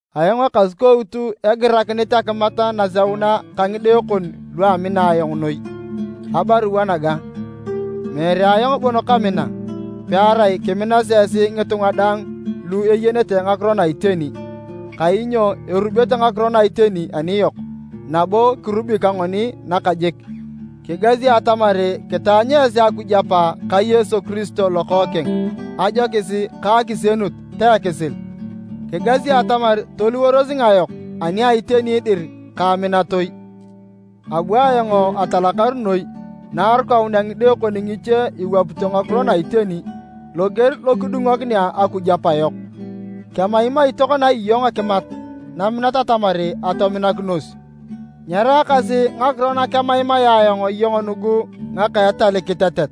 Ayong Ekasukout egirakinit akimat naseuna ka ngide kon lu amina ayong noi, abarua naga. Meere ayong bon kamina, pearai kiminasi esi ngitunga daang lu eyenete ngakiro na iteni, kainyo erubete ngakiro na iteni aniyok nabo kirubi ka ngoni nakajik. Kigasi atamar kitaanyu esi Akuj Apa ka Yesu Kiristo Lokookeng ajokis ka akisienut ta ekisil, kigasi atamar toliworos ngayok ani a iteni dir ka aminatoi. Abu ayong atalakar noi na arukaunea ngide kon ngiche iwapito ngakiro na iteni, loger lo kidungokinea Akuj Apa yok. Kemaimai tokona iyong akimat naminat atamar atominakinos. Nyeraakasi ngakiro na kemaimaea ayong iyong nugu ngaka etal kitetet,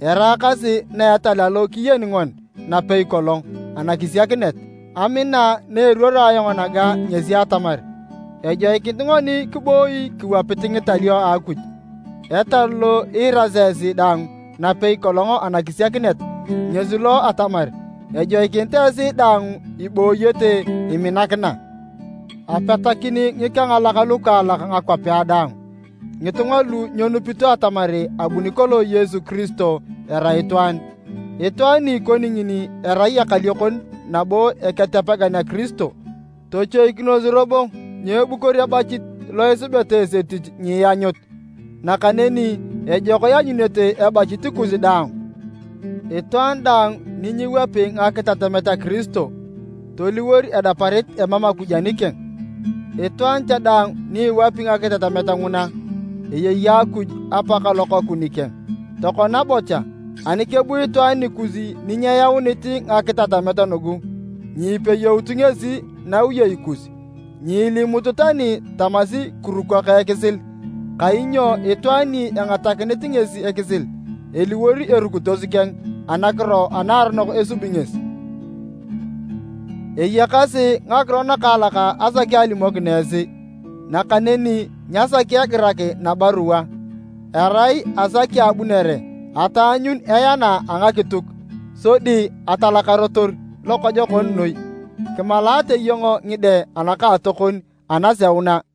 eraakasi na etal alo kiyeni ngoni napei kolong anakisiakinet. Amina na eruoro ayong naga ngesi atamar, ejoikinit ngoni kiboi kiwapit ngitalio a Akuj. Etal lo iirasi esi dang napei kolong anakisiakinet ngesi lo a atamar ejoikinit esi daang ibooyete iminakina. Apetakin ngikengalak lukaalak ngakwapea daang, ngitunga lu nyenupito atamar abuni kolong Yesu Kiristo erai itwaan. Itwaan ni ikoni ngini erai ekaliokon nabo Eketepegan a Kiristo. Tochoikinos robo nyeebukor ebachit lo isubeta esi etich nyianyut, nakaneni ejok ianyunete ebachit kus daang. Itwaan daang ni nyiwapi ngakitatamet a Kiristo, toliwor edeparit emam Akuj anikeng. Itwaan cha daang ni iwapi ngakitatamet nguna, eyei Akuj Apa ka Lokookeng nikeng. Tokona bocha, ani kebu itwaan nikus ni nyeyaunit ngakitatamet nugu, nyipeyout ngesi nawiyei kus, nyiilimut tani tamasi, “Kiruko ka ekisil.” Kainyo itwaan ni egatakinit ngesi ekisil eliwor erukitos keng anakiro anaaronok esubi ngesi. Eyakasi ngakiro nakaalak asaki alimokin esi, nakaneni nyasaki egirak nabarua. Erai asaki abunere ataanyun eana a ngakituk, sodi atalakarotor lokojokon noi. Kimalaate iyong ngide anakaatokon anaseuna.